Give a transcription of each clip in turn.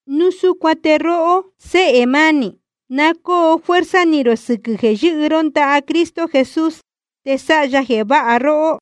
Núu súcuan te róhó, séhē mánī, na cóo fuerza ni rō sɨquɨ̄ jeē yɨ́hɨ ró ndaha Cristo Jesús te sáha ya jeē váha róhó.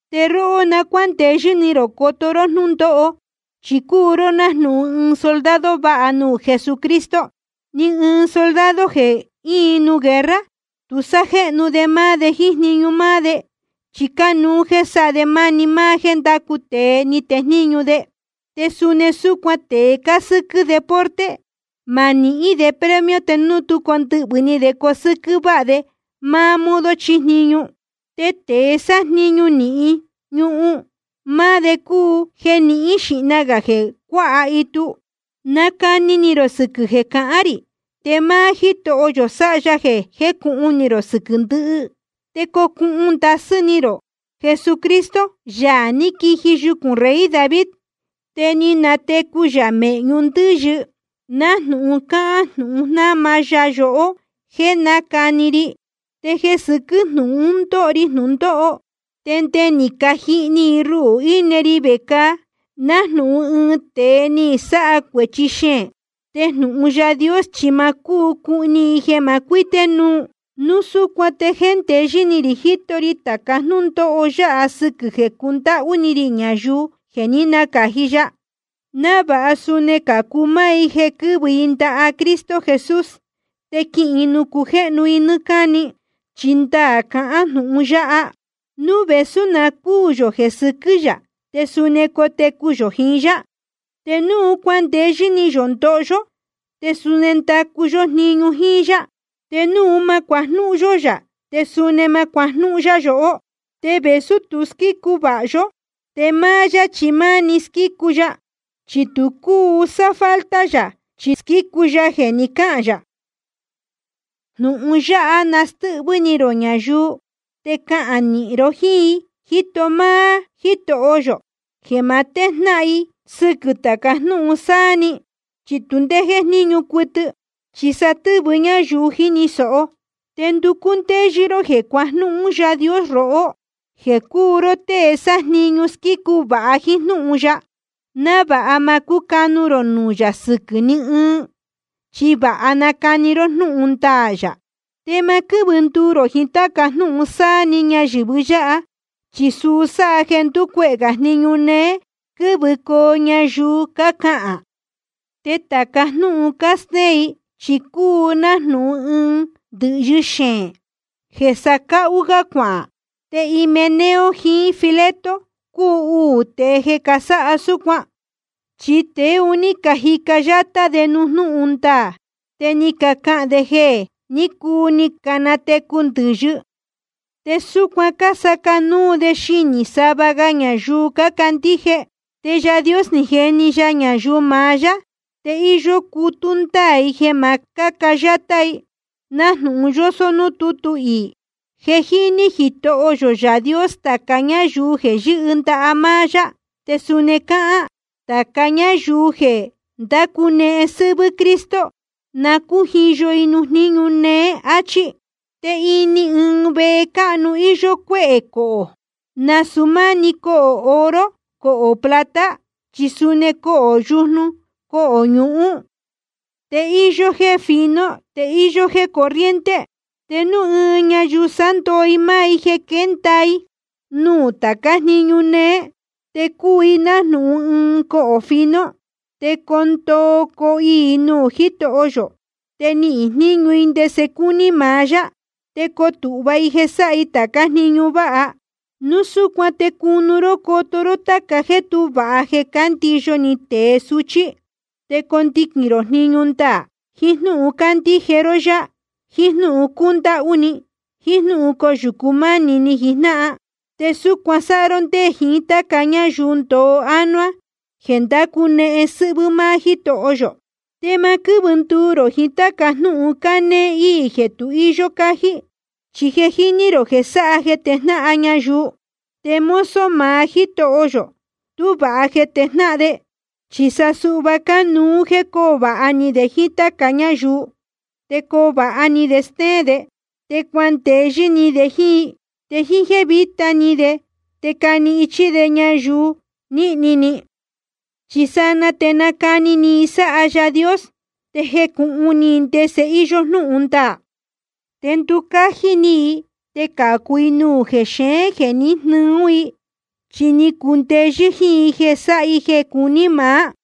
Te róhó na cuándeyɨ́ ni rō coto ró jnúndóho, chi cúu ró nájnūhun ɨɨn soldado vāha nuū Jesucristo. Ni ɨɨn soldado jeē íin nuū guerra, tu sájnéñu de máá de jíín jniñu máá de, chi cánuú jeē sáha de máni máá jéē ndácu tēe ní tejníñu de. Te suni súcuan tēe cásɨ́quɨ́ deporte, ma nihín de premio te núu tú condɨhvɨ̄ ni de cosɨ́quɨ́ váha de máá modo chíjniñu. Te tēe sájniñu nīhin ñuhun, máá de cúu jeē nihín xīhna gā jeē cuáha itu. Nacani ni rō sɨquɨ̄ jeē cahán rī, te máá Jítoho yō sáha ya jeē jécūhun ni rō sɨquɨ̄ ndɨhɨ. Te cocuhun ndasɨ́ ni rō Jesucristo, Yaā ní quiji yucūn rey David, te ni natecu yā mēhñu ndɨ́yɨ, nájnūhun cáhán jnūhun jnáma ya yohó jéē nácani ri. Te jeē sɨquɨ́ jnūhun un ndóho ri jnūndóho, te nde ni cajihni i ruhū íne ri vecāa nájnūhun ɨɨn tēe ni sáha cuēchi xeēn. Te jnūhun Yaā Dios chi ma cúu cuhni i jeē ma cuité núu. Núu súcuan te jéndeyɨ́ ni rī jíto ri tāca jnúndóho yáha sɨ́quɨ̄ jeē cundáhú ni rī ñayuu jeē ní nacāji ya, návāha suni cācu máá i jeē quɨ̄vɨ i ndaha Cristo Jesús, te quihīn i nuū cujéhnu i nɨ́ɨ́ cáni. Chi ndaā cahán jnūhun yáha: Núu vēsú na cúū yō jeē sɨquɨ́ yā, te suni cotecu yō jiín yá, te núu cuandeyɨ́ ni yō ndoho yó, te suni ndacu yó jniñu jíín yá. Te núu ma cuajnúhún yó yā, te suni ma cuajnúhún yá yohó. Te vēsú tu squícu vāha yó, te máá yá chi máni squícu ya, chi tu cúu sáfalta yā, chi squícu ya jeē ni cáhān yā. Jnūhun yáha na nástɨ́hvɨ́ ni rō ñayuu, te cahān nīhin ro jíín i, jíto máá Jítoho yō, jeē ma téjnáhan i sɨquɨ̄ tāca jnúhun sáá‑ni. Chi tu ndé jéjníñu cuɨtɨ, chi sa stɨ́vɨ ñáyuu jíni sōho. Te nducú ndéyɨ́ ró jeē cuajnúhún Yaā Dios rohó, jéē cúu ró tée sájniñu squícu vāha jíín jnúhun ya, návāha ma cúcanu rō nuū yā sɨquɨ̄ ní ɨɨn, chi vāha nacani ró jnúhun ndaā yā. Te ma quɨ́vɨ nduu rō jiín táca jnúhun sáá‑ni ñayɨ̄vɨ yáha, chi suu sáha jeē ndúcuehē gā jniñu néé quɨ́vɨcoo ñayuu cácahān. Te tāca jnúhun cástéén i chi cúu nájnūhun ɨɨn ndɨ̄hyɨ xeēn jeē sacáhú gá cuahān. Te Himeneo jiín Fileto cúu uū tēe jeē casáha súcuan. Chi tēe un ní cajica yátá de nuū jnúhun ndaā, te cácahān de jeē jé ni cuu ni canatecu ndɨ̄yɨ. Te súcuan cásaca nuu de xinī sava ñayuu cácandíje. Te Yaā Dios ni jeni ya ñayuu maá yá, te íyó cutú ndáā i jeē ma cáca yátá i, nájnūhun yósó núū tútu iī: Je jíní Jitoho yō Yaā Dios tāca ñáyuu jeē yɨ́hɨ ndaha máá yá. Te suni cáhán: Tāca ñáyuu jeē ndácunehen sɨ́hvɨ́ Cristo, na cújiyo i nuū jníñu néé, áchí. Te ini ɨɨn vehe cáhnu íyó cuéhē cohō, nasūu máni cohō oro cohō plata, chi suni cohō yujnu cohō ñuhun. Te íyó jéē fino te íyó jéē corriente. Te núu ɨɨn ñayuu sándoo i máá i jeē quénda i nuū tācá jniñu néé, te cuu i nájnūhun ɨɨn cohō fino. Te coo ndoo coo iī i nuū Jítoho yō, te nihīn jníñu i ndese cúní maá yá. Te coo tūhva i jeē sáha i tācá jniñu váha. Núu súcuan te cunu ró coto ró táca jéē tú vāha jeē cándiyo ni tēe suchí. Te condiquīn rō jniñu ndaā, jiín jnúhun cándíje ró yá, jiín jnúhun cúndáhú ni, jiín jnúhun coyūcu mánī jiín jnáhan. Te súcuan sáha ró ndé jiín táca ñáyuu ndoo ánuá jeē ndácunehen sɨ́hvɨ́ máá Jítoho yō. Te ma quɨ́vɨ nduu rō jiín táca jnúhun cánéé íī jeē tu íyó cájí, chi je jíní rō jeē sáha jeē tejnáhan ñayuu. Te mozo maá Jítoho yō, tú vāha jeē tejnáhan de, chi sa suhva cánuú jéē coo vāha ni de jíín táca ñáyuu. Te coo vāha ni de stéén de, te cuandeyɨ́ ni de jíín i. Te jíín jéē víta ni de te cani ichí de ñayuu nīhni ni. Chi sanaa te nacani ni i sáha Yaā Dios, te jecūhun ni i ndese íyó jnúhun ndaā. Te nducájí ni i te cācu i nuū jexeén jeē ní jnɨɨ ún i, chi ni cundeyɨ́ jíín i jeē sáha i jeē cuní maá.